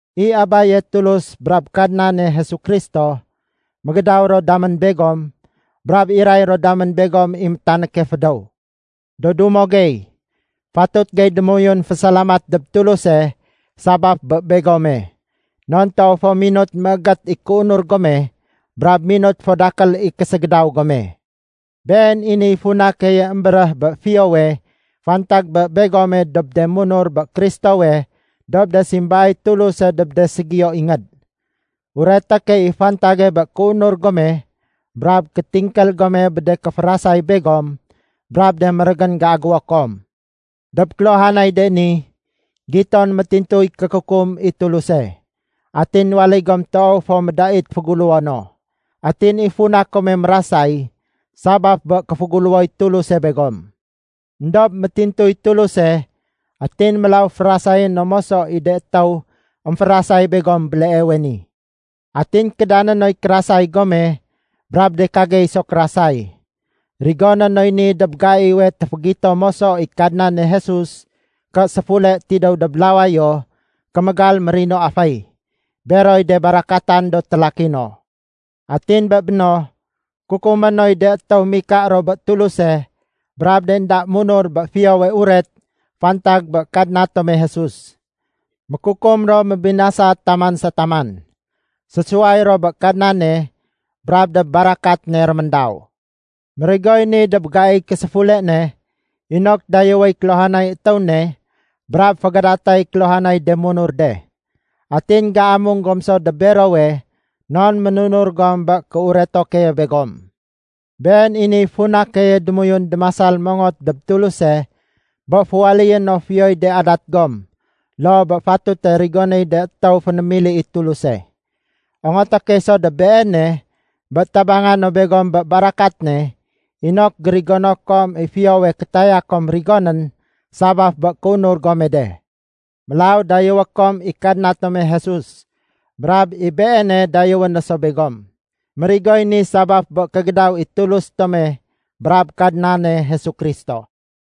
I Abaye Tulus brab Kadnane Jesu Kristo, mégédaw ro damén begom brab iray ro damén begom i métanéke fédéw. Do dumo gey, fatut gey démoyun fésalamat dob Tuluse sabaf bé begome. Non toow fo minut méégét i kéunur gome brab minut fo dakél i késégédaw gome. Been i niy funa keye émbéréh bé fiyowe fantag bé begome dob de munur bé Kristowe dob de simbaay Tuluse dob de ségiyo ingéd. Ureté key i fantage bé kéunur gome brab kétingkél gome bé de kéférasay begom brab de mérégén géagéwo kom. Dob kéluhanay de ni, giton métintuy kékukum i Tuluse, atin waléy gom toow fo médait féguléwo no. Atin i funa kome mérasay, sabaf bé kéféguléwoy Tuluse begom. Endob métintuy Tuluse atin mélaw férasayé no moso i de étéw émférasay begom béleewe ni. Atin kédané noy kérasay gome brab de kagey so kérasay. Rigoné noy ni dob gaiwe téfégito moso i Kadnane Jesus ké séfule tidéw dob lawayo kémégal mérino aféy, beroy de barakatan do télaki no. Atin bé béno kukumé noy de étéw mika ro bé Tuluse brab de énda munur bé Fiyowe Uret fantag bé Kadna tome Jesus. Mékukum ro mébinasa taman sa taman. Sésuway ro bé Kadnane brab dob barakat ne réméndaw. Mérigoy ni dob gaiy késéfule ne inok dayéwéy kéluhanay étéw ne brab fégadatay kéluhanay de munur de. Atin géamung gom so dob berowe non ménunur gom bé kéureto keye begom. Been i niy funa keye démoyun démasal mongot dob Tuluse bé féwaléyé no fiyoy de adat gom loo bé fatute rigonéy de étéw fénémili i Tuluse. Ongoté key so dob Beene bé tabanga no begom bé barakat ne inok gérigono kom i fiyowe kétaya kom rigonén sabaf bé kéunur gome de. Mélaw dayéwé kom i Kadna tome Jesus, brab i Beene dayéwé no so begom. Mérigoy ni sabaf bé kégédaw i Tulus tome brab Kadnane Jesu Kristo.